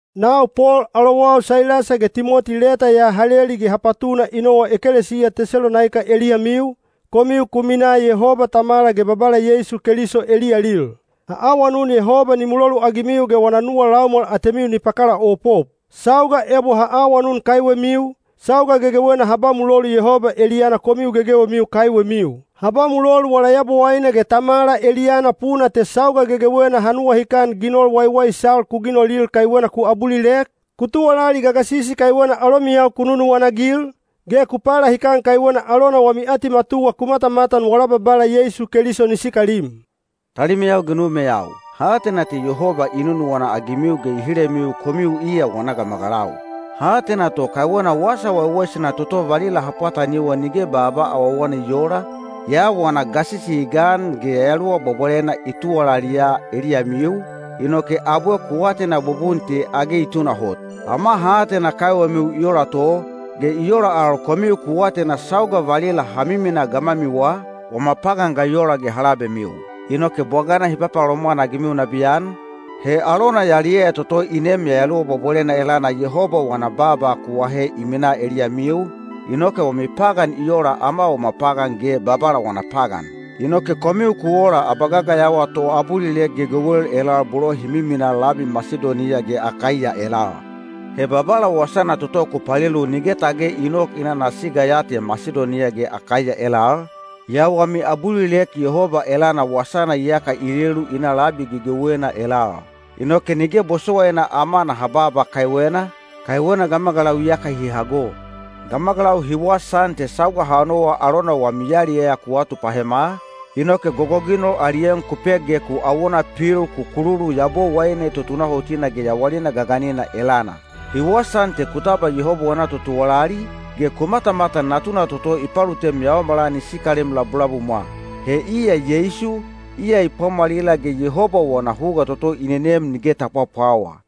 Nau Pol alowau Sailasa ge Timoti leta ya ha leli ge ha patuna i nowa ekelesiya Tesalonaika eliyamiu, komiu ku minaa Yehoba Tamala ge Babala Yeisu Keliso eliyalil. Ha awanun Yehoba ni muloluagimiu ge wana nuwa laumwal atemiu ni pakalaopop. Sauga ebo ha awanun kaiwemiu, sauga gegewena ha ba mulolu Yehoba eliyana komiu gegewemiu kaiwemiu. Ha ba mulolu wala Yabowaine ge Tamala eliyana puna te sauga gegewena ha nuwahikan ginol waiwaisal ku ginolil kaiwena ku abulilek, ku tuwalali gagasisi kaiwena alomiyau ku nunuwana-agil, ge ku palahikan kaiwena alona wami atimatuwa ku matamatan wala Babala Yeisu Keliso ni sikalim. Talimeyau ge numeyau, ha atena te Yehoba i nunuwana-agimiu ge i hilemiu komiu iya wana gamagalau. Ha atena to kaiwena wasa waiwaisana toto valila ha pwataniwa nige baaba awawana i oola, yaa wana gasisi i gan ge Yayaluwa Bwabwalena i tuwalaliya eliyamiu, inoke abwe ku atena bubun te age i tunahot. Ama ha atena kaiwemiu i ola to, ge i ola al komiu ku atena sauga valila ha miminaa gamwamiwa, wama pagan ga i ola ge ha labemiu. Inoke bwagana hi papalomwan-agimiu nabiyan, he alona yaliyaya toto i neem Yayaluwa Bwabwalena elana Yehoba wana baaba ku ahe i minaa eliyamiu, inoke wami pagan i ola ama wama pagan ge Babala wana pagan. Inoke komiu ku ola abagagayawa toabulilek gegewel elal bolo hi miminaa labi Masidoniya ge Akaiya elal. He Babala wasana toto ku palelu nige tage i nok i na ana siga ya te Masidoniya ge Akaiya elal, yaa wami abulilek Yehoba elana wasana iyaka i lelu i na labi gegewena elal. Inoke nige bosowaina ama naha baaba kaiwena, kaiwena gamagalau iyaka hi hago. Gamagalau hi wasaan te sauga ha nowa alona wami yaliyaya ku atupahema, inoke gogoginol ali en ku pek ge ku awona pil ku kululu Yabowaine tutunahotina ge yawalina gaganina elana. Hi wasaan te ku tabwa Yehoba wana totuwalali, ge ku matamatan Natuna toto i palutem yaomala ni sikalem labulabumwa. He iya Yeisu, iya i pwamwalila ge Yehoba wana huga toto i nenem nige ta pwapwawa.